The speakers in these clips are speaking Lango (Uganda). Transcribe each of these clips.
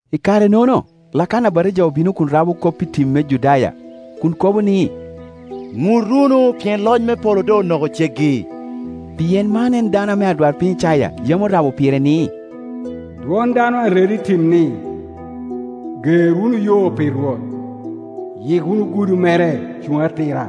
I kare-nono Lakana Abatija obino kun rabo kop i tim me Judaya, kun kobo ni, “Ŋut wunu, pien loc me polo doŋ onoko ceggi.” Pien man en baŋ o ame adwarpiny Icaya yam orabo pire ni, “Dwon baŋ o a redo i tim ni, Ger wunu yo pi Rwot, yik wunu gudo mere cuŋ atira.”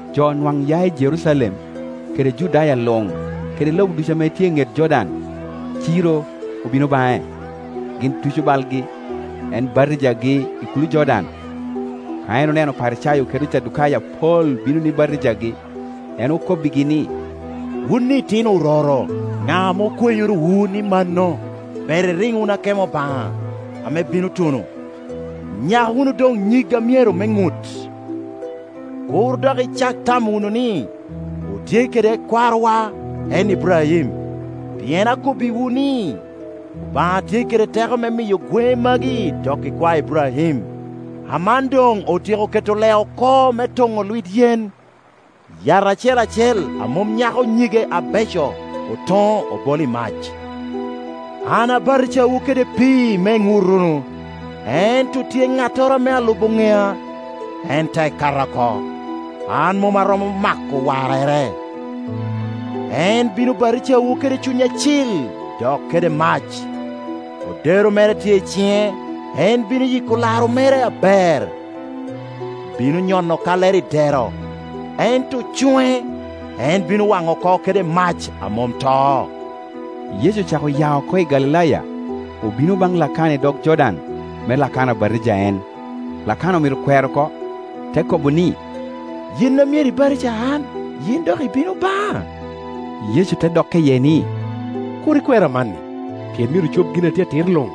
Jo nwaŋ ya i Jerucalem, kede Judaya luŋ, kede lobo ducu ame tye i ŋet Jor baŋ, ciro, obino baŋe. Gin tuco balgi, en batijagi i kulo Jordan. Ka en oneno Oparicayo kede Ocadukayo apol bino ni batijagi, en okobbigi ni, “Wun itino ororo, ŋa ame okwenyorowu ni mano ber iriŋ wunu akemo Obaŋa ame bino tuno? Nyak wunu doŋ nyig a myero me ŋut, kur dok icak tamo wunu ni, ‘Otye kede kwarowa en Iburaim’; pien akobbiwu ni, Obaŋa tye kede teko me miyo gweŋe magi doko ikwae Iburaim. Aman doŋ otyeko keto lee oko me toŋo lwit yen; yat acel acel a mom nyako nyige abeco, otoŋo, obolo i mac. “An abatijawu kede pii me iŋut wunu, ento tye ŋattoro ame alubo ŋea, en tek kata oko: an mom aromo mako warrere. En bino batijawu kede Cuny Acil, dok kede mac. Odero mere tye i ciŋe, en bino yiko laro mere aber, bino nyono kallere i dero, ento cuŋe, en bino waŋo oko kede mac a mom to.” Yecu ocako ya oko i Galilaya, obino baŋ Lakana i dog Jordan, me Lakana batija en. Lakana omito kwero oko, te kobo ni, “Yin a myero ibatija an, yin dok ibino baŋa?” Yecu te dokke iye ni, “Kur ikwer amanni, pien myero ocob gin atye atir luŋ”;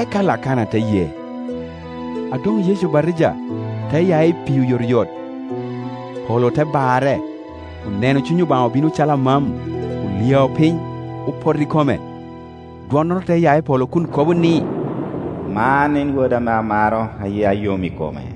eka Lakana te ye. A doŋ Yecu obatija, te ya i pii oyotoyot, polo te barre. Oneno Cuny Obaŋa obino calo amam, olyao piny, opoto i kome. Dwonnoro te ya i polo kun kobo ni, “Man en Woda ame amaro, a yia yom i kome.”